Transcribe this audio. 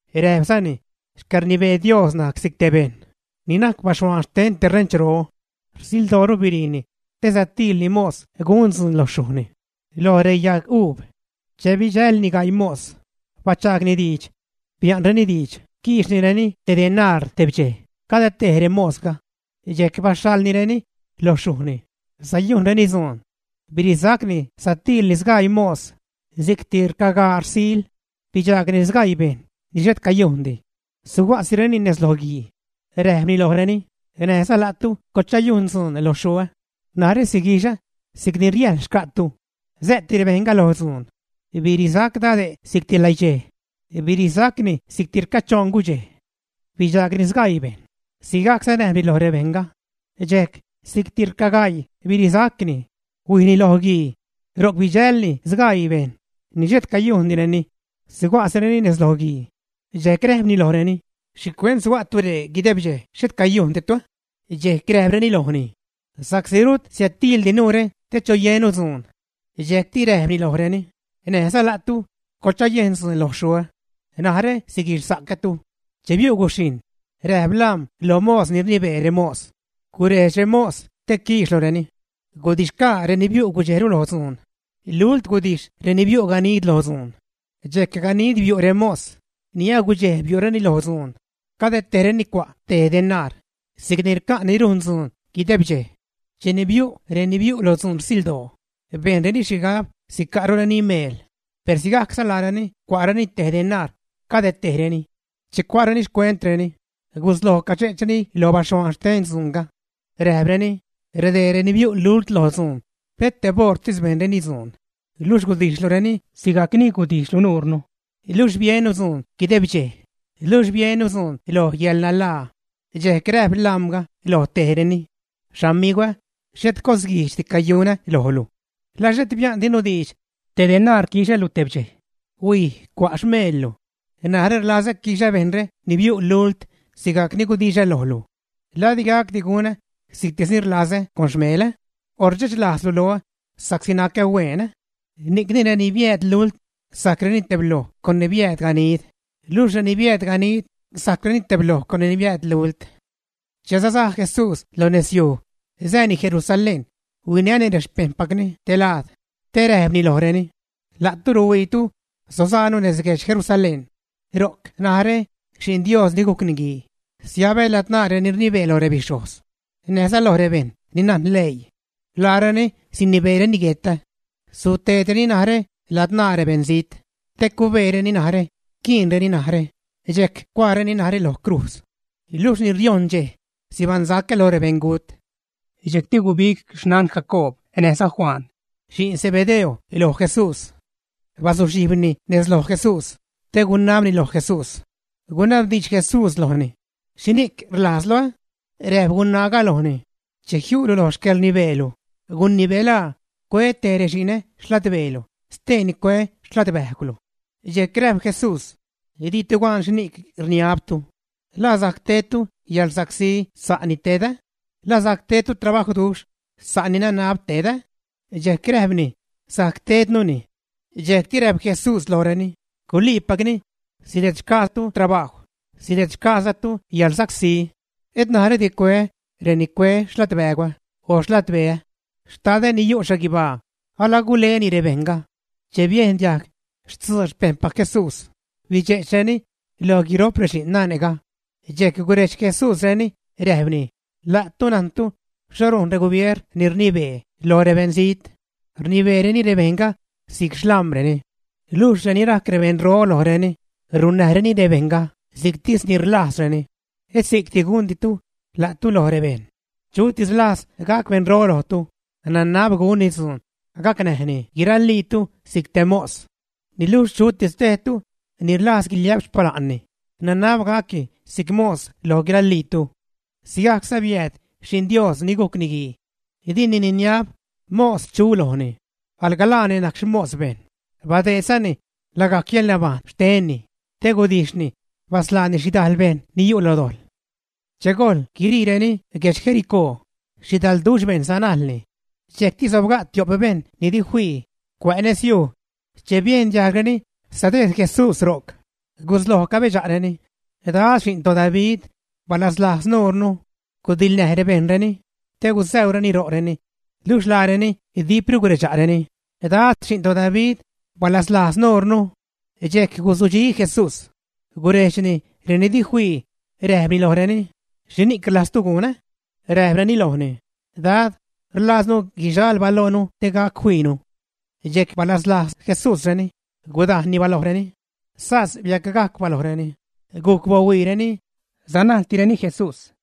Räjpzani: ―Xcäḻrnibee Dios najc si'c te bejṉ ni najc baxhuaan xten te renchro. Rsildooru biriini te satiilni mos gun dzuun lo xyujni, lo reyaguub. Che bidxälni gaii mos, bachaagni diidx. Bia'nreni diidx quiixnireni te denaar tebdxej cade tej remosga. Dxejc baxhaḻnireni loj xyujni sayujnreni dzuun. Birisacni, satiilni sgaii mos si'cti rcagaa, rsil. Bidxaagni sgaii bejṉ ni xhet cayujndi, suga'sireni nez lo guii. Räjpni lojreni: “Näjza la'tu coḻchayujn dzuun lo xyuä. Narä siguixä si'cni riäjḻ xca'tu.” Sä'ti rebejṉga lo dzuun. Birisac dade' si'cti läiidxej, birisaczani si'cti rcachoṉ gudxej. Bidxaagni sgaii bejṉ, sigajcza räjpni loj rebejṉga. Dxejc si'cti rcagaii birisacni, huijni lo guii. Ro'c bidxälni sgaii bejṉ ni xhet cayujndireni, suga'sireni nez lo guii. Dxejc räjpni lojreni: “¿Xhicuent suga'tu ree guideb dxej xhet cayujnditu?” Dxejc räjpreni lojni: “Sa'csi rut siädtiildinu te choyennu dzuun.” Dxejcti räjpni lojreni: “Näjza la'tu coḻchayejn dzuun lo xyuä. Narä siguixsa'cätu.” Che biu' guxhijṉ, räjp lam̲ lo mos ni rnibee remos: “Gurejdx remos te quiixlureni. Gudix-xgaa reni biu' gudxejru lo dzuun. Lult gudijx reni biu' ganid lo dzuun.” Dxejc ganid biu' remos ni agudxej biu'reni lo dzuun. Cade tejreni cua' te denaar, si'cni rca' ni rujn dzuun guideb dxej. Cheni biu' reni biu' lo dzuun rsildoo, bejnreni xhigab sica'rureni meel, per sigajcza laareni cua'reni te denaar cade tejreni. Che cua'reni xcuentreni gusloj cadxe'chreni lo baxhuaan xten dzuunga. Räjpreni: “Redee ni biu' lult lo dzuun pet teb oṟtis bejnreni dzuun, luxh gudijxlureni sigajcni gudijxlu nuurnu, luxh biennu dzuun guideb dxej, luxh biennu dzuun lo yäḻnanlaa.” Dxejc räjp lamga lo tejreni: “Xamigwä, xhet cosguijdxdi cayunä lojlu. ¿La xhet bia'ndinu diidx te denaar quixälu tebdxej? Huij, cua' xmeellu. Narä rlazä quixä bejṉre ni biu' lult sigajc ni gudixä lojlu. ¿La di gacdi gunä si'ctis ni rlazä con xmelä? ¿O rdxechlajzlu loä sa'csi nacä hueen, ä?” Ni'cni reni biääd lult sajcreni tebloj con reni biääd ganid, luxh reni biääd ganid sajcreni tebloj con reni biääd lult. Che sasaj Jesús lo nezyuj sääni Jerusalén, huinäni rexpejṉpacni te laad te räjpni lojreni: ―La'tu ruhuiitu sosaanu nez guedx Jerusalén. Ro'c narä, Xi'n Dios ni gujc Niguii, siabä ladzṉaa reni rnibee lo rebixhojz, näjza lo rebejṉ ni najn leii. Laareni sinibeereni guetä. Suteedreni narä ladzṉaa rebeṉzijt te cubeereni narä quiinreni narä, dxejc gucuaareni narä lo crujz. Luxh ni riojṉ dxej, sibaṉsacä loj rebeṉgut. Dxejcti gubig xnan Jacoob näjza Juan, xi'n Zebedeo loj Jesús. Bazuxhijbni nez loj Jesús, te gunabni lo Jesús. Gunabdiidx Jesús lojni: ―¿Xhini'c rlajzlu? Räjp gunaaga lojni: ―Che jiu'lu lo xcäḻrnibeelu, gunibelaa cue tej rexi'nä xladbeelu, steeni cue xladbäjgwlu. Dxejc räjp Jesús: ―¡Ditu gan xhini'c rniabtu! ¿La sajc tedtu yäḻrsacsí sa'ni tedä? ¿La sajc tedtu trabajwduxh sa' ni nanab tedä? Dxejc räjpreni: ―Sajc tednuni. Dxejcti räjp Jesús lojreni: ―Guliipacni. Sidedxgaatu trabajw, sidedxgaazatu yäḻrsacsí. Et narädi cueä reni cue xladbägwä o xladbeä. Xtadä ni yu' xhaguibaa alaguleni rebejṉga. Che biejn diajg stzuu rexpejṉpac Jesús, bidxe'chreni loj guiro'p rexi'n nane'ga. Dxejc gurejdx Jesús reni, räjpni: ―La'tu najntu xho rujn regubier ni rnibee lo rebeṉzijt, rnibeereni rebejṉga si'c xlam̲reni. Luxh reni najc rebeṉro lojreni runnäjreni rebejṉga si'ctis ni rlajzreni. Et si'cni gunditu la'tu loj rebejṉ. Chutis rlajz gac beṉro lojtu, nanab gunni dzuun gacnäjni guiraliitu si'c te mos. Luxh chutis tejtu ni rlajz guiliä'p xpala'nni, nanab gacni si'c xmos lo guiraliitu. Sigajcza biääd Xi'n Dios ni gujc Niguii. Dini niniab mos chu lojni, alga laani najc xmos bejṉ, badeedzani lagajc yäḻnabajṉ xtenni te gudijxni basḻaani xhidal bejṉ ni yu' lo dojḻ. Che gojl guiriireni guedx Jericó, xhidalduxh bejṉ sanajlni. Dxejcti sobga' tio'p bejṉ ni di fii cuä' nez yuj. Che biejn diajgreni sadejd Jesús ro'c, gusloj cabedxa'reni: ―Dad, Xi'n toDavid, balazlajz nuurnu. Gudiḻnäj rebejṉreni, te gusäureni ro'reni. Luxh laareni dipru guredxa'reni: ―¡Dad, Xi'n toDavid, balazlajz nuurnu! Dxejc guzudxi Jesús, gurejdxni reni di fii, räjpni lojreni: ―¿Xhini'c rlajztu gunä? Räjpreni lojni: ―Dad, rlaaznu guixal balojnu te gac fiinu. Dxejc balazlajz Jesúsreni, gudajnni balojreni. Sas biacgajc balojreni, gujc bahuiireni, sanajltireni Jesús.